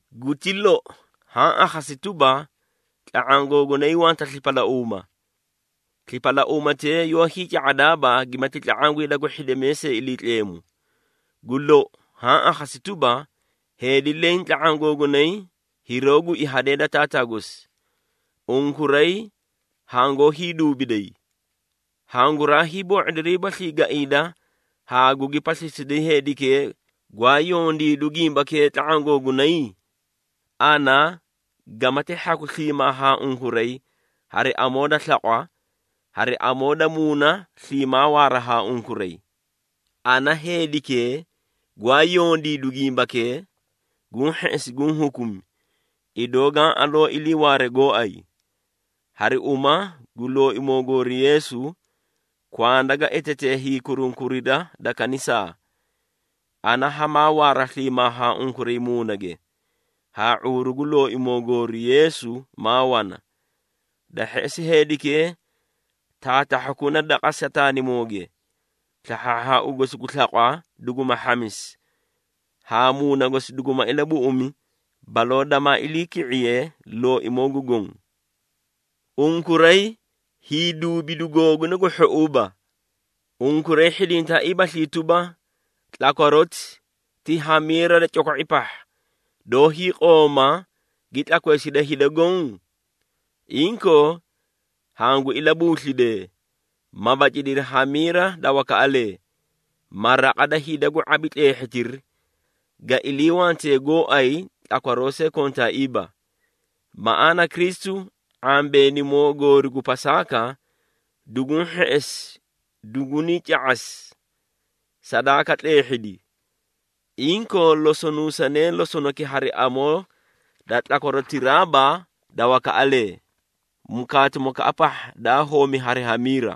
Guti lou, haã akhasi tuba, tla⁄aã googunay wanta slipalauuma. Slipalauumatee yoó hiica⁄adaaba gimati tla⁄aã gu hida gu hhidimee see Iliitleemu. Gu lou haã akhasi tuba, heedi leẽ tla⁄aã googunay hiroó gui hadee da taataa gosi. Unkuray hangoó hiiduubiday! Hanguraay boo⁄odiriibaslii gaiida haa gugi paslisiday heedikee, gwaa yondiidu gimbakee tla⁄aã googunay? Ana gamati hhaku sliimaa haa unkuray hari amoo da slaqwa, hari amoo da muuna sliimaa waaraa haa unkuray. Ana heedikee gwaa yondiidu gimbakee, guũ hheꞌesi guũ hukumi, idoo gaã aloo iliiwaaree gooay. Hari uma gu Looimoo goori Yeesu, kwanda ga etetee hiikurunkurida da kanisaa. Ana hamaa waara sliimaa haa unkuray muunage, haa ⁄uuru gu Looimoo goori Yeesu maa wana. Da hheꞌesi heedikee taatahhakuna daqa Sataanimooge, slahhaahhaau gosi gu slaqwa duguma hhamisi, haa muuna gosi duguma ilabuꞌumi baloo damaa iliiki⁄iye Looimoo gu Goõ. Unkuray hiiduubidu googuna gu hhouuba. Unkuray hhidintaaiibaslii tuba, tlakwaroti ti hamiira da coko⁄i pahha, doó hiiqoma gi tlakweesida hida goõ? Inkoo, hangu ilabuuslidee, ma bacidiri hamiira da wakaꞌalee, ma raqa da hida gu ⁄abi tleehhitiri, ga iliiwante gooay tlakwaroo see kontaaiiba. Maꞌaana Kristu, ⁄ambeenimoo goori gu Pasaaka, duguũ hheꞌesi dugunii ca⁄asi, sadaaka tleehhidi. Inkoo, losonuusanee losonaki hari amoo da tlakwarotiraaba da wakaꞌalee, mukaatimokaꞌa pahha daa homi hari hamiira.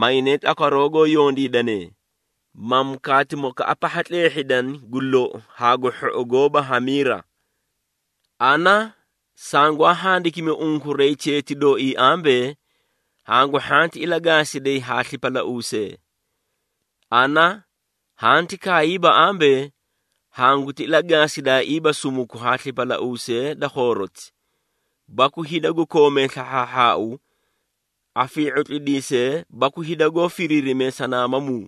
Maynee tlakwaroo goó yondiidane, ma mukaatimokaꞌa pahha tleehhidani gu lou haa gu hhou, goóba hamiira. Ana sangwaa handikimi unkuray cheeti dooii ambee, hangu hhanti ilagaasiday haa slipalauusee. Ana hanti kaayiiba ambee, hanguti ilagaasidaaiiba sumuku haa slipalauusee da khooroti, baku hida gu koomee slahhaahhaau, afii⁄utlidiisee baku hida goó firiirimee sanaamamuu.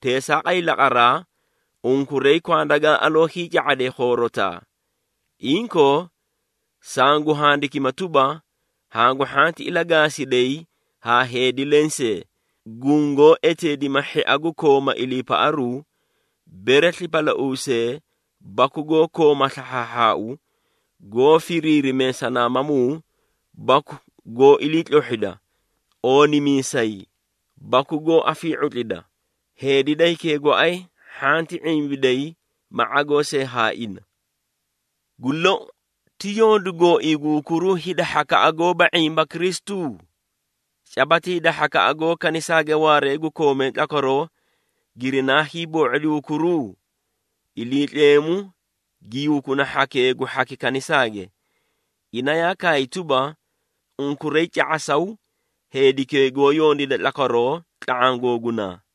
Teesaaqay laqaraa, unkuray kwanda gaa aloo hiica⁄adee khoorotaa. Inkoo, sangu handikima tuba, hangu hhanti ilagaasiday haa heedi lensee, gungoó eteedima hhia gu kooma iliipaꞌaruu, bere slipalauusee, baku goó kooma slahhaahhaau, goó firiirimee sanaamamuu baku goó iliitlohhida, oonimiisay, baku goó afii⁄utlida. Heedi da hikee gooay hhanti ⁄imbiday ma ⁄agoo see haa ina. Gu lou, ti yondu gooii gu hukuruu hida hhakaꞌa goóba ⁄imba Kristu? Caba ti hida hhakaꞌa goó kanisaage waaree gu koomee tlakwaroo, girinaa hiiboo⁄odi hukuruu? Iliitleemu gi hukuna hhakee gu hhaki kanisaage. Ina yaa kaay tuba, “Unkuray ca⁄asaw heedikee goó yondiida tlakwaroo tla⁄aã googunaa.”